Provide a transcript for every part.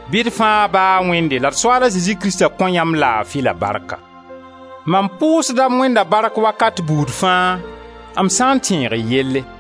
Bɩ d fãa Ba a Wẽnde la d Soaal a Zezi Krista kõ yãmb laafi la barka! Mam pʋʋsda m Wẽnda bark wakat buud fãa, m sã n tẽeg y yelle.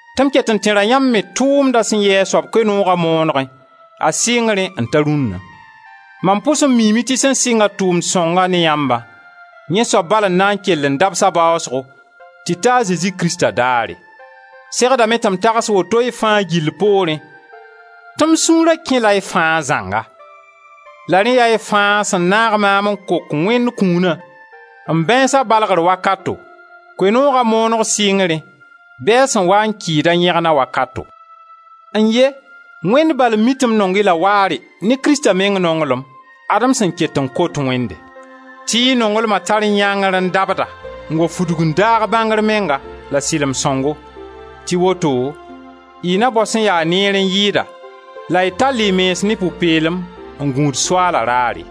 tɩ m ket n tẽra yãmb me tʋʋmdã sẽn yɩ a soaba Koe-nooga moonegẽ, a sɩngrẽ n ta rũnna. Mam pʋs n miime tɩ sẽn sɩnga tʋʋmd sõnga ne yãmbã, yẽ soab bal n na n kell n dabs a baasgo tɩ ta Krista a Zezi daare. Segdame tɩ m tags woto y fãa gill poorẽ tɩ m sũura kɛla y fãa zãnga; la rẽ yaa y fãa sẽn naag maam n kok Wẽnd kũuna, m bãeensa balgr wakato, Koe-nooga mooneg sɩngrẽ, bɩ a sẽn waa n kɩɩd a yẽgna wakato. N-ye! Wẽnd bal n mi tɩ m nong-y la waare ne Krista meng nonglem! Ad-m sẽn ket n kot Wẽmde: tɩ y nonglma tar yãngr n dabda n wa fudg n daag bãngr menga, la sɩlem sõngo, tɩ woto y na bao sẽn ya neer n yɩɩda la y tall y mens ne pʋ-peelem n gũud Soaala raare.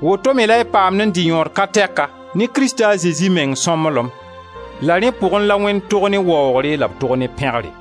Woto-me la y paamd n dɩ yõod ka tɛka ne Krista a Zezi meng sõmblem, la rẽ pʋgẽ la Wẽnd tog ne waoogre la b tog ne pẽgre!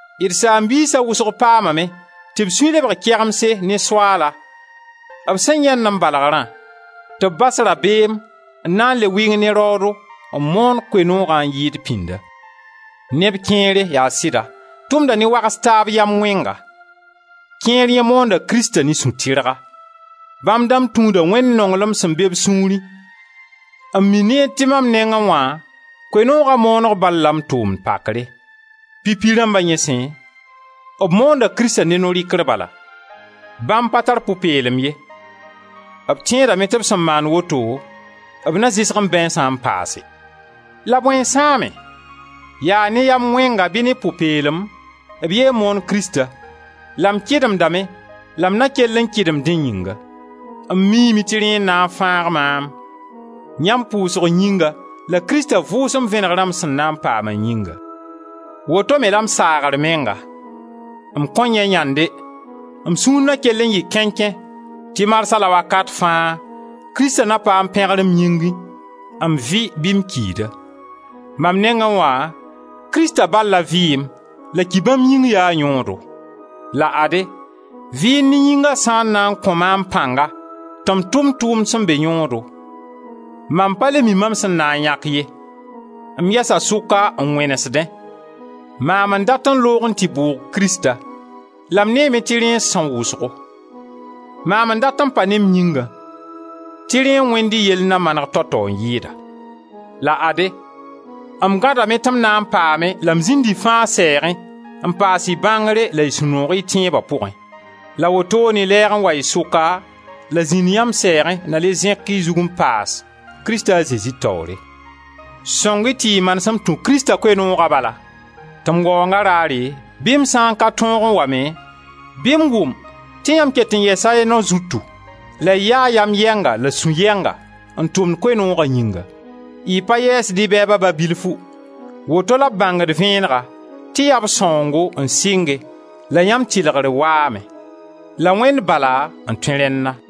D saam-biisa wʋsg paamame tɩ b sũy lebg kegemse ne Soaala, b sẽn yãend m balgrã, tɩ b bas rabeem n na n le wɩng ne raoodo n moon Koe-noogã n yɩɩd pĩnda. Neb kẽere, yaa sɩda, tʋmda ne wags taab yam wẽnga; kẽer yẽ moonda Krista ne sũ tɩrga. Bãmb dãmb tũuda Wẽnd nonglem sẽn be b sũurẽ n mi neer tɩ mam nengẽ wã Koe-nooga mooneg bal la m tʋʋm pakre. Pipi rãmba yẽ sẽ, b moonda Krista ne no-rɩkr bala; bãmb pa tar pʋ-peelem ye. B tẽedame tɩ b sẽn maand woto b na zɩsg m bãeensã n paase. La bõe n sãame? Yaa ne yam wẽnga bɩ ne pʋ-peelem, b yee n moon Krista; la m kɩdemdame la m na kell n kɩdem dẽ yĩnga. M miime tɩ rẽ n na n fãag maam, yãmb pʋʋsg yĩnga la Krista Vʋʋsem Vẽnegrã m sẽn na n paama yĩnga. Woto-me la m saagr menga: m kõn yãe yãnde, m sũur na kell n yɩ kẽnkẽ, tɩ marsa la wakat fãa, Krista na paam pẽgre m yĩngẽ, m vɩ bɩ m kida. Mam nengẽ wã, Krista bal la vɩɩm la ki bãmb yĩng yaa yõodo. La ade, vɩɩnd ne yĩnga sã n na n kõ maam pãnga tɩ m tʋm tʋʋmd sẽn be yõodo, mam pa le mi mam sẽn na n yãk ye. M yɛsa sʋka n wẽnesdẽ: maam n dat n loog n tɩ bʋʋg Krista, la m neeme tɩ rẽ n sãoẽ wʋsgo; maam n dat n pa ne m yĩngã, tɩ rẽ n wẽnd y yell na maneg tao-tao n yɩɩda. La ade, m gãdame tɩ m na n paame la m zĩnd y fãa sɛɛgẽ n paas y bãngre la sũ-noog y tẽeba pʋgẽ. La wotoone lɛɛg n wa y sʋka, la zĩnd yãmb sɛɛgẽ, na le zẽk y zug n paas, Krista a Zezi taoore. Sõng-y tɩ y manesem tũ Krista Koe-nooga bala, tɩ m waoonga raare bɩ m sã n ka tõog n wa me, bɩ m wʋm tɩ yãmb ket n yɛsa y nao zutu la y yaa yam yɛnga la sũ-yɛnga n tʋmd Koe-nooga yĩnga. Y pa yɛɛsd y bɛɛba ba bilfu, woto la b bãngd vẽenega tɩ yaa b sãoongo n sɩnge, la yãmb tɩlgre waame, la Wẽnd bala n tõe rẽnna.